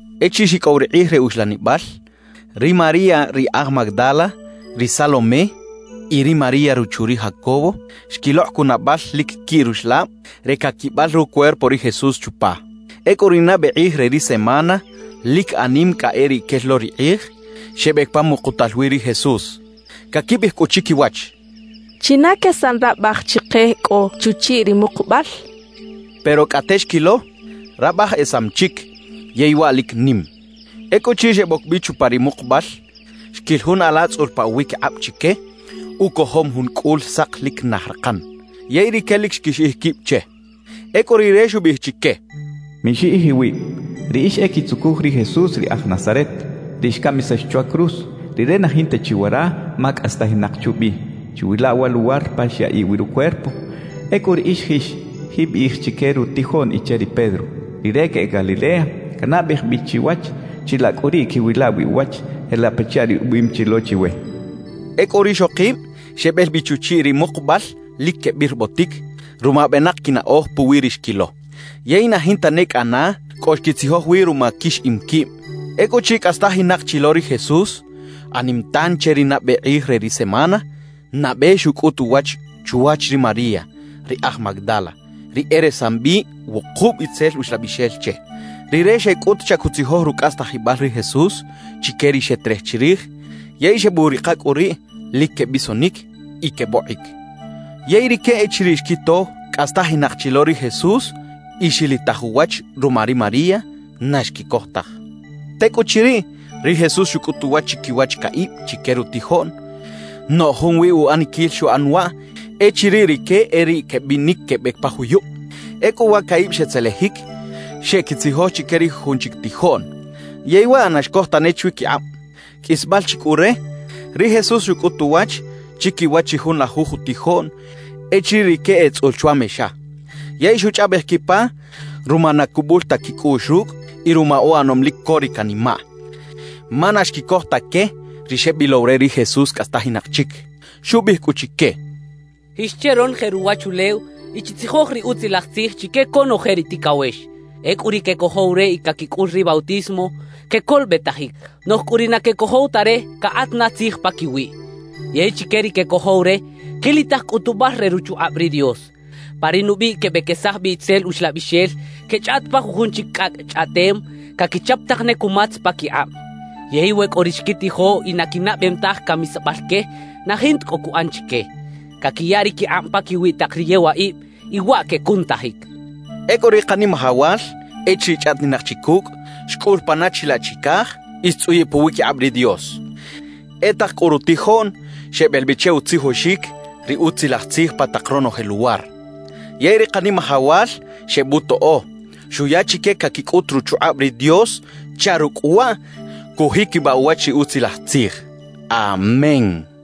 Echiriꞌ xicꞌow ri kꞌij re uxlanibal, ri María ri aj Magdala, ri Salomé y ri María ruchu ri Jacobo, xquilokꞌ cunabal lic quiꞌ ruxlab re caquibal rucuerpo ri Jesús chupa. Ecꞌu ri nabe kꞌij re ri semana lic anim cꞌa e riꞌ quel lo ri kꞌij, xebec pa mukutal wi ri Jesús. Caquibiꞌij cꞌu chiquiwach: «¿China quesan rabaj chike cꞌo chuchiꞌ ri mukubal?» quechaꞌ. Pero cꞌate xquilo, rabaj esam chic, yey waꞌ lic nim. Ecꞌuchiriꞌ xeboc bi chupa ri mukubal, xquil jun ala tzꞌul pa uwiquikꞌab chique, ucojom jun cꞌul sak lic naj rakan. Yey rique lic xquixiꞌij quib che. Ecꞌu rire xubiꞌij chique: —Mixiꞌij iwib. Riꞌix e quitzucuj ri Jesús ri aj Nazaret, ri xcamisax chwa cruz; Rire na jinta chi wara, ma cꞌastajinak chubi. Chiwila wa luwar pa xyaꞌiꞌ wi rucuerpo. Ecꞌu riꞌix jix, jiꞌbiꞌij chique rutijoꞌn y che ri Pedro: “Rire queꞌec Galilea, canabej bi chiwach; chilaꞌ cꞌu riꞌ quiꞌwila wi uwach, jelaꞌ pachaꞌ ri ubiꞌim chi lo chiwe” —xchaꞌ. Ecꞌu rixokib xebel bi chuchiꞌ ri mukubal lic quebirbotic ruma benak quinaꞌoj puwi ri xquilo; yey na jinta ne cꞌana cꞌo xquitzijoj wi ruma quixiꞌim quib. Ecꞌuchiriꞌ cꞌastajinak chi lo ri Jesús, anim tan che ri nabe kꞌij re ri semana, nabe xucꞌut uwach chwach ri María ri aj Magdala, ri e resam bi wukub itzel uxlabixel che. Rire xeꞌec cꞌut chaꞌ cuꞌtzijoj rucꞌastajibal ri Jesús chique ri xeterej chirij yey xebuꞌrika cꞌu riꞌ lic quebisonic y quebokꞌic. Yey rique echiriꞌ xquito cꞌastajinak chi lo ri Jesús y xilitaj uwach ruma ri María, na xquicoj taj. Tecꞌuchiriꞌ, ri Jesús xucꞌut uwach chiquiwach caꞌib chique rutijoꞌn, noꞌj junwi uꞌaniquil xuꞌan waꞌ echiriꞌ rique e riꞌ quebinic quebec pa juyub. Ecꞌu wa caꞌib xetzelejic, xeꞌquitzijoj chique ri jujun chic tijoꞌn; yey waꞌ na xcoj tane chwiquikꞌab. Qꞌuisbal chi cꞌu re, ri Jesús xucꞌut uwach chiquiwach ri junlajuj utijoꞌn echiriꞌ rique etzꞌul chwa mexa, yey xuchꞌaꞌbej quipa ruma na cubul ta quicꞌuꞌx rucꞌ y ruma uꞌanom lic co ri canimaꞌ, ma na xquicoj ta que ri xebilow re ri Jesús cꞌastajinak chic. Xubiꞌij cꞌu chique: —Jix che ronoje ruwachulew y chitzijoj ri Utzilaj Tzij chique conoje ri ticawex. Ecꞌu ri quecojow re y caquicꞌul ri bautismo, quecolobetajic. Noꞌj cꞌu ri na quecojow ta re, cakꞌat na tzij paquiwiꞌ. Yey chique ri quecojow re, quilitaj cꞌutubal re ruchukꞌab ri Dios. Pa ri nubiꞌ quebequesaj bi itzel uxlabixel, quechꞌaꞌt pa jujun chic cꞌacꞌ chꞌaꞌtem, caquichap tak ne cumatz paquikꞌab. Yey we cꞌo ri xquitijo y na quinaꞌbem taj camisabal que, na jinta cꞌo cuꞌan chique. Caquiya ri quikꞌab paquiwi tak ri yewaꞌib, y waꞌ quecunutajic —xchaꞌ. Ecꞌu ri Kanimajawal echiriꞌ chꞌaꞌtinak chi cucꞌ, xcꞌul pana chilaꞌ chicaj y xtzꞌuyiꞌ puwiquikꞌab ri Dios. E tak cꞌu rutijoꞌn xebel bi che utzijoxic ri Utzilaj Tzij pa tak ronoje luwar. Yey ri Kanimajawal xebutoꞌo, xuya chique caquicꞌut ruchukꞌab ri Dios chaꞌ rucꞌ waꞌ cujiquibaꞌ uwach ri Utzilaj Tzij. Amén.